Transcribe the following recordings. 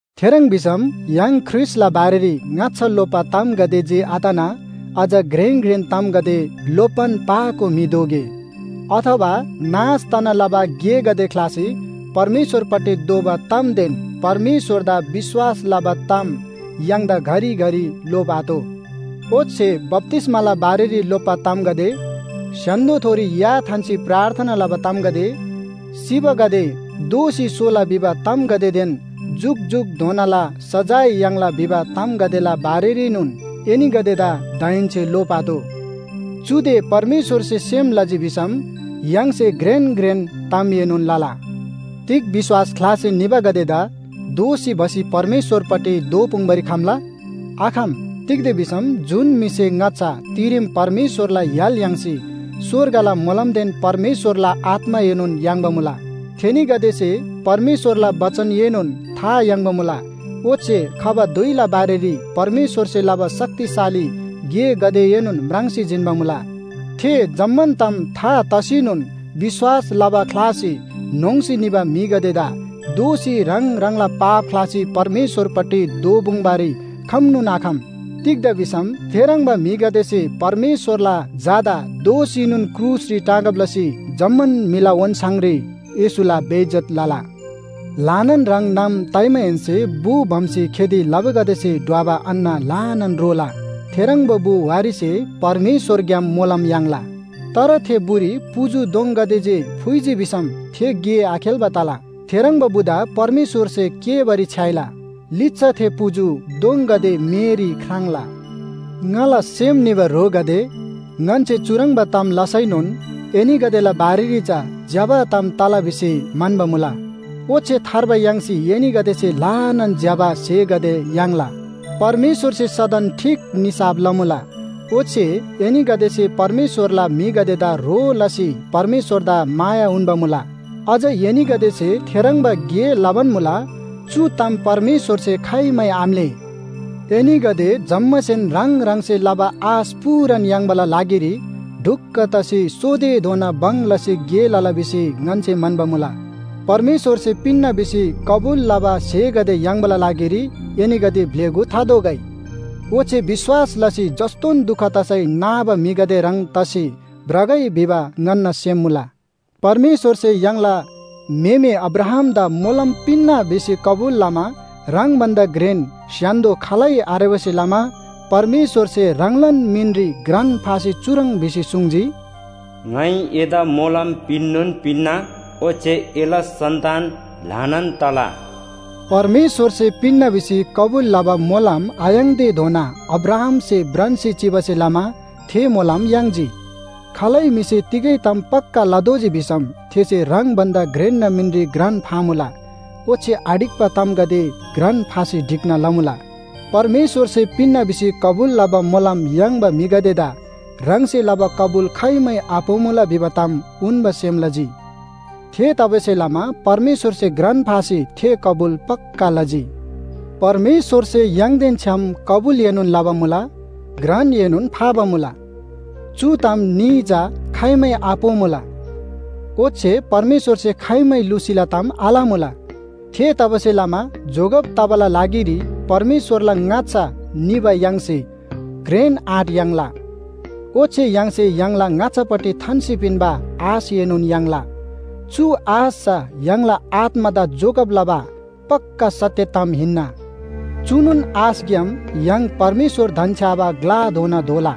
थेह्रङ् भिसम य्‍हाङ ख्रीष्‍टला बारेरी ङाच्‍छा लोप्‍बा तामगदे जे आतना अझ घ्रेन घ्रेन तामगदे लोप्‍बान पाको म्‍हि दोगे। अथवा नाश तना लबा गेगदे ख्‍लासी परमेश्‍वरपट्टि दोःबा तामदेन परमेश्‍वरदा विश्‍वास लबा ताम य्‍हाङदा घरिघरि लोप्‍आतोः। ओच्‍छे बप्‍तिस्‍माला बारेरी लोप्‍बा तामगदे, स्‍य्‍हान्‍दोथोरी या थान्‍सी प्रार्थना लबा तामगदे, सिबागदे दोःसी सोला भिबा तामगदेदेन जुकजुकधोनाला सजाय याङ्ला भिबा तामगदेला बारेरीनोन एनीगदेदा दाहेन्‍से लोप्‍आतोः। चुदे परमेश्‍वरसे सेम लजी भिसम य्‍हाङसे घ्रेन घ्रेन तामएनोन लला। तिग विश्‍वास ख्‍लासी निबागदेदा दोःसी भसी परमेश्‍वरपट्टि दोःपुङ्‌बारी खम्‍ला? आखम। तिग्‍दा भिसम जुन म्‍हिसे ङाच्‍छा तिरेम परमेश्‍वरला य्‍हाल याङ्सी स्‍वर्गला मोलमदेन परमेश्‍वरला आत्‍माएनोन याङ्बा मुला। थेनीगदेसे परमेश्‍वरला बचनएनोन था याङ्बा मुला ओच्‍छे खबा धुइला बारेरी परमेश्‍वरसे लबा शक्तिशाली गेगदेएनोन म्राङ्सी जिन्‍बा मुला। थे जम्‍मान ताम था तसीनोन विश्‍वास लबा ख्‍लासी न्‍होङ्‌सी निबा म्‍हिगदेदा दोःसी ह्राङ ह्राङला पाप ख्‍लासी परमेश्‍वरपट्टि दोःपुङ्‌बारी खम्‍नोन आखम। तिग्‍दा भिसम थेह्रङ्बा म्‍हिगदेसे परमेश्‍वरला झादा दोःसीनोन क्रुसरी टाँगब लसी जम्‍मान म्‍हिला ओन्‍छाङरी येशूला बेइज्‍जत लला। ल्‍हानान ह्रङ् नाम ताइमाहेन्‍से बु भम्‍सी खेती लबागदेसे ढ्वबा अन्‍न ल्‍हानान रोला। थेह्रङ्बा बु वारीसे परमेश्‍वरग्‍याम मोलम याङ्ला। तर थे बुरी पुजु दोङगदे जे फुइजी भिसम थे गे आखेल्‍बा तला। थेह्रङ्बा बुदा परमेश्‍वरसे केःबारी छ्‌याइला। लिच्‍छा थे पुजु दोङगदे मेरी ख्राङ्ला। ङाला सेम निबा ह्रोगदे, ङन्‍से चुह्रङ्बा ताम लसैनोन एनीगदेला बारेरी चा ज्‍यबा ताम तला भिसी म्‍हन्‍बा मुला। ओच्‍छे थार्बा याङ्सी एनीगदेसे ल्‍हानान ज्‍यबा स्‍हेगदे याङ्ला। परमेश्‍वरसे सदन ठीक निसाफ लमुला, ओच्‍छे एनीगदेसे परमेश्‍वरला म्‍हिगदेदा ह्रो लसी परमेश्‍वरदा माया उन्‍बा मुला। अझ एनीगदेसे थेह्रङ्बा गे लबान मुला, चु ताम परमेश्‍वरसे खाइमै आम्‍लेः। एनीगदे जम्‍मासेन ह्राङ ह्राङसे लबा आश पूरान याङ्बाला लागिरी ढुक्‍क तसी सोतेधोना भङ लसी गे लला भिसी ङन्‍से म्‍हन्‍बा मुला। परमेश्‍वरसे पिन्‍ना भिसी कबुल लबा स्‍हेगदे याङ्बाला लागिरी एनीगदे ब्‍लेगु थादोगै। ओच्‍छे विश्‍वास लसी जस्‍तोन दुख तसै नाबा म्‍हिगदे ह्रङ् तसी भ्रगै भिबा ङन्‍ना सेम मुला। परमेश्‍वरसे य्‍हाङला म्‍हेमे अब्राहामदा मोलम पिन्‍ना भिसी कबुल लमा ह्राङ भन्‍दा घ्रेन स्‍य्‍हान्‍दो खालै आरेबासे लमा परमेश्‍वरसे ह्राङलान मिनरी घ्रान फासी चुह्रङ् भिसी सुङ्जी, “ङाइ एदा मोलम पिन्‍नोन पिन्‍ना, ओच्‍छे एला सन्‍तान ल्‍हानान तला।” परमेश्‍वरसे पिन्‍ना भिसी कबुल लबा मोलम आयाङ्‌तेधोना अब्राहामसे भ्रान्‍सी चिबासे लमा थे मोलम याङ्जी। खालै म्‍हिसे तिगै ताम पक्‍का लतोःजी भिसम थेसे ह्राङ भन्‍दा घ्रेन्‍ना मिनरी घ्रान फामुला, ओच्‍छे आढिक्‍बा तामगदे घ्रान फासी ढिक्‍ना लमुला। परमेश्‍वरसे पिन्‍ना भिसी कबुल लबा मोलम याङ्बा म्‍हिगदेदा ह्राङसे लबा कबुल खाइमै आपोमुला भिबा ताम उन्‍बा सेम लजी। थेतबासेलमा परमेश्‍वरसे घ्रान फासी थे कबुल पक्‍का लजी। परमेश्‍वरसे य्‍हाङदेन छ्‌याम कबुलएनोन लबा मुला, घ्रानएनोन फाबा मुला। चु ताम न्‍ही चा खाइमै आपोमुला। ओच्‍छे परमेश्‍वरसे खाइमै लुसीला ताम आलमुला। थेतबासेलमा जोगब तबाला लागिरी परमेश्‍वरला ङाच्‍छा निबा य्‍हाङसे घ्रेन आँट याङ्ला। ओच्‍छे य्‍हाङसे य्‍हाङला ङाच्‍छापट्टि थान्‍सी पिन्‍बा आशएनोन याङ्ला। चु आश चा य्‍हाङला आत्‍मादा जोगब लबा पक्‍का सत्‍य ताम हिन्‍ना। चुनोन आशग्‍याम य्‍हाङ परमेश्‍वर धन्‍छ्‌याबा ग्‍लाधोना धोला।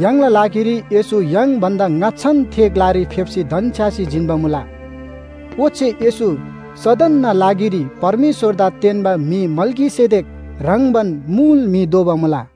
य्‍हाङला लागिरी येशू य्‍हाङ भन्‍दा ङाच्‍छान थे ग्‍लारी फेप्‍सी धन्‍छ्‌यासी जिन्‍बा मुला। ओच्‍छे येशू सदनना लागिरी परमेश्‍वरदा तेन्‍बा म्‍हि मल्‍कीसेदेक ह्रङ्‌बान मुल म्‍हि दोबा मुला।